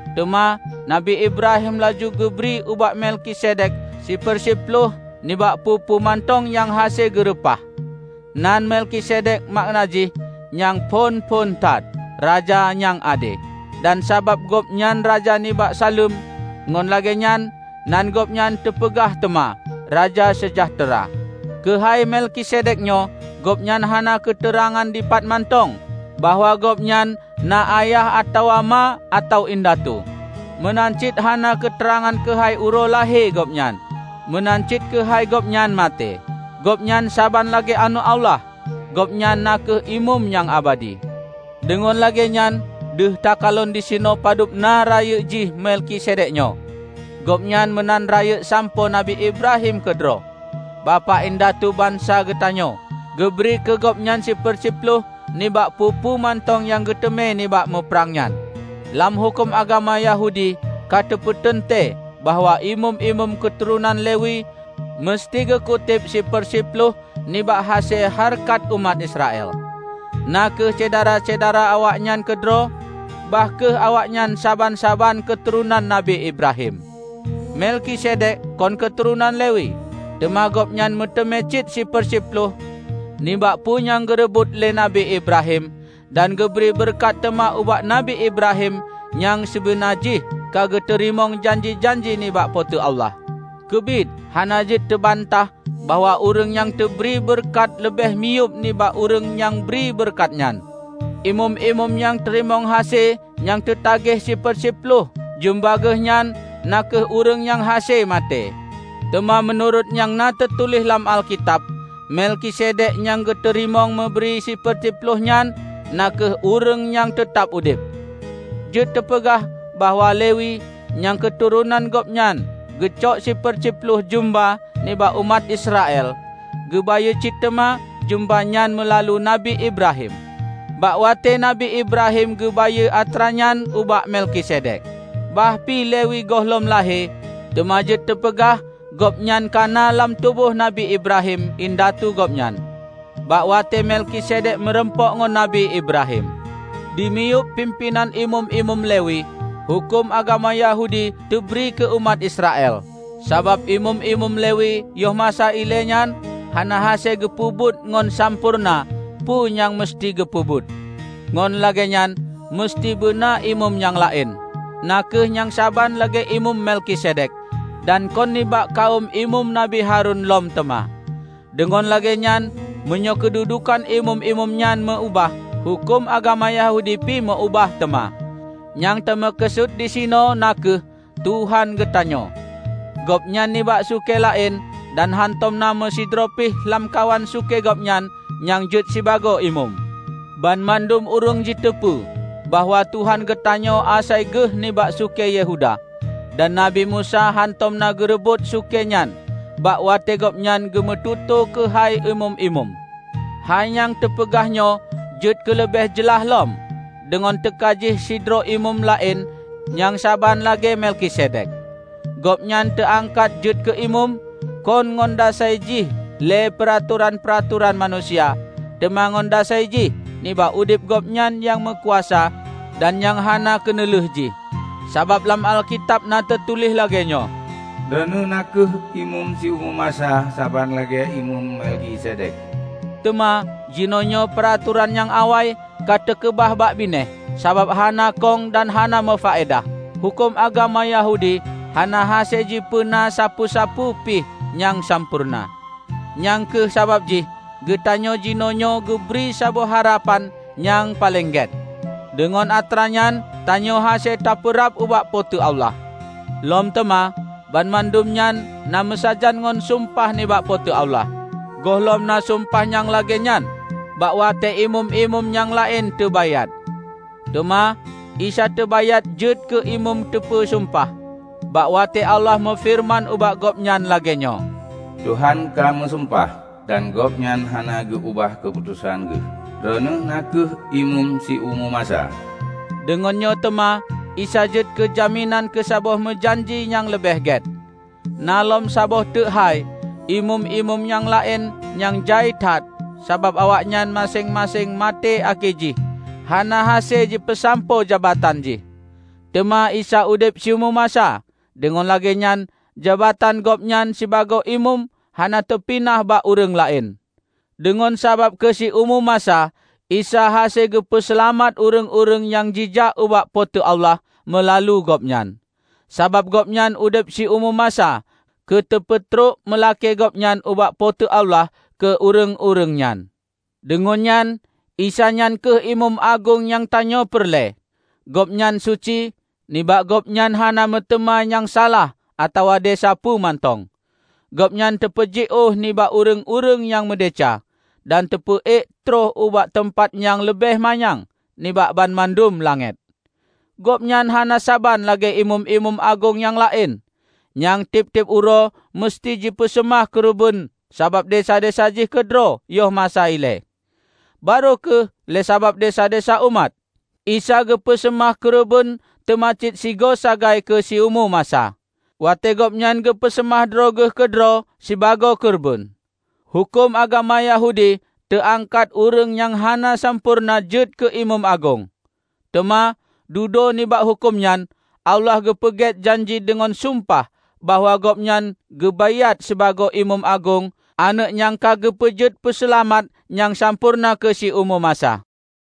Teuma Nabi Ibrahim laju geubri ubak Melkisedek siper siploh nibak peue-peue mantong nyang hase geureupah. (Nan Melkisedek makna jih, nyang phon-phon that, "Raja nyang ade"; dan sabab gobnyan raja nibak Saleuem, ngon lagée nyan nan gobnyan teupeugah teuma, "Raja Seujahteura".) Keuhai Melkisedek nyoe gobnyan hana keuteurangan dipat mantong bahwa gobnyan na ayah atawa ma atawa indatu; meunan cit hana keuteurangan keuhai uroe lahé gobnyan, meunan cit keuhai gobnyan maté. Gobnyan saban lagée Aneuëk Allah; gobnyan na kheueh imeum nyang abadi. Deungon lagée nyan, deuh takalon disinoe padub na rayeuk jih Melkisedek nyoe; gobnyan meunan rayeuk sampoe Nabi Ibrahim keudroe, bapak indatu bansa geutanyoe, geubri keu gobnyan siper siploh nibak peue-peue mantong nyang geuteumé nibak muprang nyan. Lam huköm agama Yahudi ka teupeuteuntée bahwa imeum-imeum keuturonan Lewi meuseuti geukuteb siper siploh nibak hase hareukat umat Israel, na kheueh syedara-syedara awaknyan keudroe, bah kheueh awaknyan saban-saban keuturonan Nabi Ibrahim. Melkisedek kon keuturonan Lewi, teuma gobnyan meuteumé cit siper siploh nibak peue nyang geureubot lé Nabi Ibrahim, dan geubri beureukat teuma ubak Nabi Ibrahim nyang sibeuna jih ka geuteurimong janji-janji nibak Po teu Allah. Keubiet hana jeuet teubantah bahwa ureuëng nyang teubri beureukat leubeh miyueb nibak ureuëng nyang bri beureukat nyan. Imeum-imeum nyang teurimong hase nyang teutageh siper siploh jeumba geuhnyan na kheueh ureuëng nyang hase maté. Teuma meunurot nyang na teutuléh lam Alkitab, Melkisedek nyang geuteurimong meuneubri siper siploh nyan na kheueh ureuëng nyang teutab udeb. Jeuet teupeugah bahwa Lewi -- nyang keuturonan gobnyan geucok siper siploh jeumba nibak umat Israel -- geubayeue cit teuma jeumba nyan meulalu Nabi Ibrahim, bak watée Nabi Ibrahim geubayeue atra nyan ubak Melkisedek. Bah pi Lewi gohlom lahé, teuma jeuet teupeugah gobnyan kana lam tuboh Nabi Ibrahim indatu gobnyan, bak watée Melkisedek meurumpok ngon Nabi Ibrahim. Di miyueb pimpénan imeum-imeum Lewi, huköm agama Yahudi teubri keu umat Israel. Sabab imeum-imeum Lewi yoh masa ilée nyan hana hase geupeubuet ngon sampoereuna peue nyang meuseuti geupeubuet, ngon lagée nyan meuseuti beuna imeum nyang laén, na kheueh nyang saban lagée Imeum Melkisedek, dan kon nibak kawöm Imeum Nabi Harun lom teuma! Deungon lagée nyan, meunyoe keududukan imeum-imeum nyan meu ubah, huköm agama Yahudi pi meu ubah teuma. Nyang teumeukeusut disinoe na kheueh Tuhan geutanyoe: Gobnyan nibak sukée laén, dan hantom na meusidroe pih lamkawan sukée Gobnyan nyang jeuet sibagoe imeum. Banmandum ureuëng jiteupeu bahwa Tuhan geutanyoe asai geuh nibak sukée Yehuda; dan Nabi Musa hantom na geurebot sukée nyan bak watée gobnyan geumeututoe keuhai imeum-imeum. Hai nyang teupeugah nyoe jeuet keuleubeh jeulaih lom, deungon teuka jih sidroe imeum laén nyang saban lagée Melkisedek. Gobnyan teuangkat jeuet keu imeum, kon ngon dasai jih lé peuratoran-peuratoran manusia, teuma ngon dasai jih nibak udeb gobnyan nyang meukuasa dan nyang hana keuneulheueh jih. Sabab lam Alkitab na teutuléh lagée nyoe, "Droeneueh na kheueh imeum siumu masa, saban lagée imeum Melkisedek." Teuma, jinoenyoe peuratoran nyang awai ka teukeubah bak binéh, sabab hana kong dan hana meufaedah. Huköm agama Yahudi hana hase jipeuna sapeue-sapeue pih nyang sampoereuna. Nyang kheueh sabab jih geutanyoe jinoenyoe geubri saboh harapan nyang paleng gét; deungon atra nyan tanyoe hase tapeurab ubak Po teu Allah. Lom teuma, banmandum nyan na meusajan ngon sumpah nibak Po teu Allah. Gohlom na sumpah nyang lagée nyan bak watée imeum-imeum nyang laén teu baiát. Teuma Isa teubaiát jeuet keu imeum teupeu sumpah, bak watée Allah meufeureuman ubak Gobnyan lagée nyoe, "Tuhan ka meusumpah, dan Gobnyan hana geu ubah keuputosan Geuh, 'Droeneueh na kheueh imeum siumu masa.' " Deungon nyoe teuma Isa jeuet keujaminan keusaboh meujanji nyang leubeh gét. Na lom saboh teuk hai: imeum-imeum nyang laén nyan jai that, sabab awaknyan maséng-maséng maté akhé jih hana hase jipeusampoe jabatan jih. Teuma Isa udeb siumu masa, deungon lagée nyan jabatan Gobnyan sibagoe imeum hana teupinah bak ureuëng laén. Deungon sabab keu siumu masa Isa hase geupeu seulamat ureuëng-ureuëng nyang jijak ubak Po teu Allah meulalu Gobnyan, sabab Gobnyan udeb siumu masa keu teupeutrok meulakée Gobnyan ubak Po teu Allah keu ureuëng-ureuëng nyan. Deungon nyan, Isa nyan kheueh Imeum Agong nyang tanyoe peureulée. Gobnyan suci; nibak Gobnyan hana meuteuma nyang salah atawa desya peue mantong. Gobnyan teupeujiôh nibak ureuëng-ureuëng nyang meudesya, dan teupeu ék trok ubak teumpat nyang leubeh manyang nibak banmandum langét. Gobnyan hana saban lagée imeum-imeum agong nyang laén, nyang tieb-tieb uroe meuseuti jipeuseumah keureubeuen sabab desya-desya jih keudroe yoh masa ilée, barô kheueh lé sabab desya-desya umat. Isa geupeu seumah keureubeuen teuma cit sigoe sagai keu siumu masa, watée Gobnyan geupeu seumah droe Geuh keudroe sibagoe keureubeuen. Huköm agama Yahudi teu angkat ureuëng nyang hana sampoereuna jeuet keu imeum agong. Teuma dudoe nibak huköm nyan, Allah geupeugét janji deungon sumpah bahwa Gobnyan geu baiát sibagoe Imeum Agong, Aneuëk nyang ka geupeupeujeuet Peuseulamat nyang sampoereuna keu siumu masa.